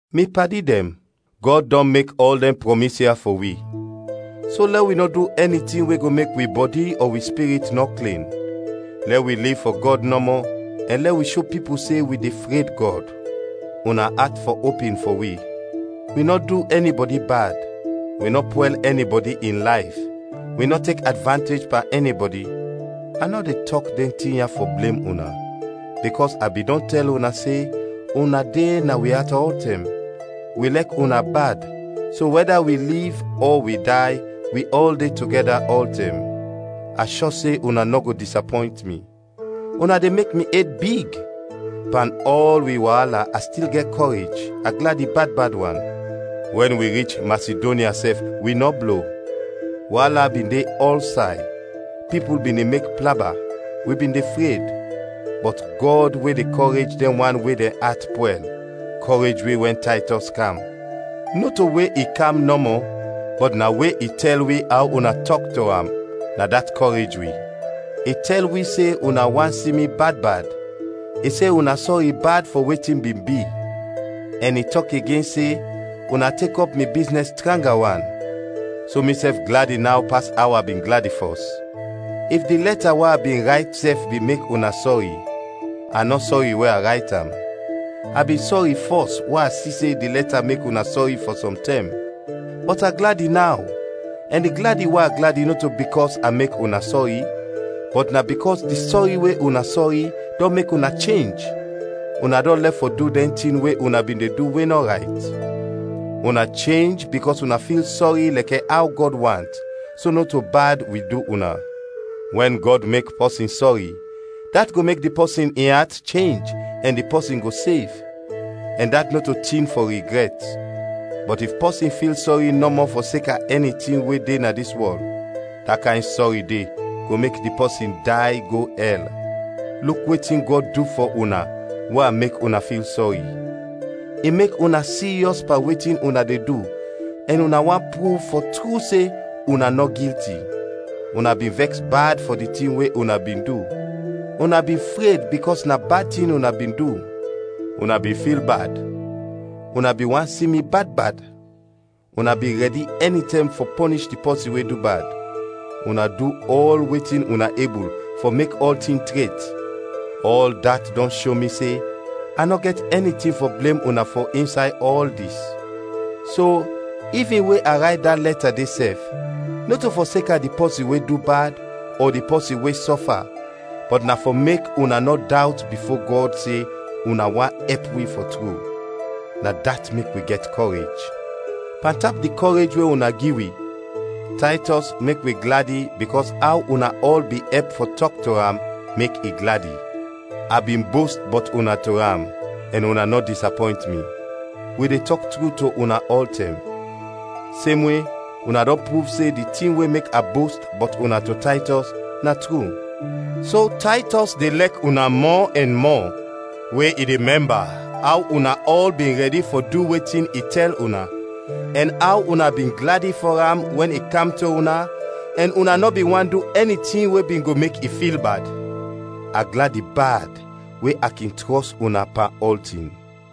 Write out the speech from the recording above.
Mi padi dɛn, Gɔd dɔn mek ɔl dɛn prɔmis ya fɔ wi. So, lɛ wi nɔ du ɛni tin we go mek wi bɔdi ɔ wi spirit nɔ klin, lɛ wi liv fɔ Gɔd nɔmɔ, ɛn lɛ wi sho pipul se wi de fred Gɔd. Una at fɔ opin fɔ wi. Wi nɔ du ɛnibɔdi bad, wi nɔ pwɛl ɛnibɔdi in layf, wi nɔ tek advantej pan ɛnibɔdi. A nɔ de tɔk dɛn tin ya fɔ blem una, bikɔs a bin dɔn tɛl una se una de na wi at ɔltɛm, wi lɛk una bad, so wɛda wi liv ɔ wi day, wi ɔl de togɛda ɔltɛm. A shɔ se una nɔ go disapɔynt mi, una de mek mi ed big! Pan ɔl wi waala a stil gɛt kɔrej, a gladi bad bad wan. Wɛn wi rich Masidonya sɛf wi nɔ blo. Waala bin de ɔlsay, pipul bin de mek plaba, wi bin de fred. Bɔt Gɔd we de kɔrej dɛn wan we dɛn at pwɛl, kɔrej wi wɛn Taytɔs kam. Nɔto we i kam nɔmɔ bɔt na we i tɛl wi aw una tɔk to am, na dat kɔrej wi. I tɛl wi se una want si mi bad bad, i se una sɔri bad fɔ wetin bin bi, ɛn i tɔk igen se una tek ɔp mi biznɛs tranga wan; so misɛf gladi naw pas aw a bin gladi fɔs. If di lɛta we a bin rayt sɛf bin mek una sɔri, a nɔ sɔri we a rayt am. A bin sɔri fɔs we a si se di lɛta mek una sɔri fɔ sɔm tɛm. Bɔt a gladi naw, ɛn di gladi we a gladi nɔto bikɔs a mek una sɔri bɔt na bikɔs di sɔri we una sɔri, dɔn mek una chenj, una dɔn lɛf fɔ du dɛn tin we una bin de du we nɔ rayt. Una chenj bikɔs una fil sɔri lɛkɛ aw Gɔd want, so nɔto bad wi du una. Wɛn Gɔd mek pɔsin sɔri, dat go mek di pɔsin in at chenj ɛn di pɔsin go sev, ɛn dat nɔto tin fɔ rigrɛt. Bɔt if pɔsin fil sɔri nɔmɔ fɔseka ɛni tin we de na dis wɔl, da kayn sɔri de go mek di pɔsin day go ɛl. Luk wetin Gɔd du fɔ una we a mek una fil sɔri: i mek una siryɔs pan wetin una de du ɛn una want pruv fɔ tru se una nɔ gilti! Una bin vɛks bad fɔ di tin we una bin du; una bin fred bikɔs na bad tin una bin du, una bin fil bad; una bin want si mi bad bad; una bin rɛdi ɛnitɛm fɔ pɔnish di pɔsin we du bad! Una du ɔl wetin una ebul fɔ mek ɔltin tret. Ɔl dat dɔn sho mi se a nɔ gɛt ɛni tin fɔ blem una fɔ insay ɔl dis. So, ivin we a rayt da lɛta de sɛf, nɔto fɔseka di pɔsin we du bad, ɔ di pɔsin we sɔfa, bɔt na fɔ mek una nɔ dawt bifo Gɔd se una want ɛp wi fɔ tru. Na dat mek wi gɛt kɔrej. Pantap di kɔrej we una gi wi, Taytɔs mek wi gladi bikɔs aw una ɔl bin ɛp fɔ tɔk to am, mek i gladi. A bin bost bɔt una to am, ɛn una nɔ disapɔynt mi. Wi de tɔk tru to una ɔltɛm. Semwe, una dɔn pruv se di tin we mek a bost bɔt una to Taytɔs, na tru. So Taytɔs de lɛk una mɔ ɛn mɔ, we i de mɛmba aw una ɔl bin rɛdi fɔ du wetin i tɛl una, ɛn aw una bin gladi fɔ am wɛn i kam to una ɛn una nɔ bin want du ɛni tin we bin go mek i fil bad. A gladi bad we a kin trɔs una pan ɔltin.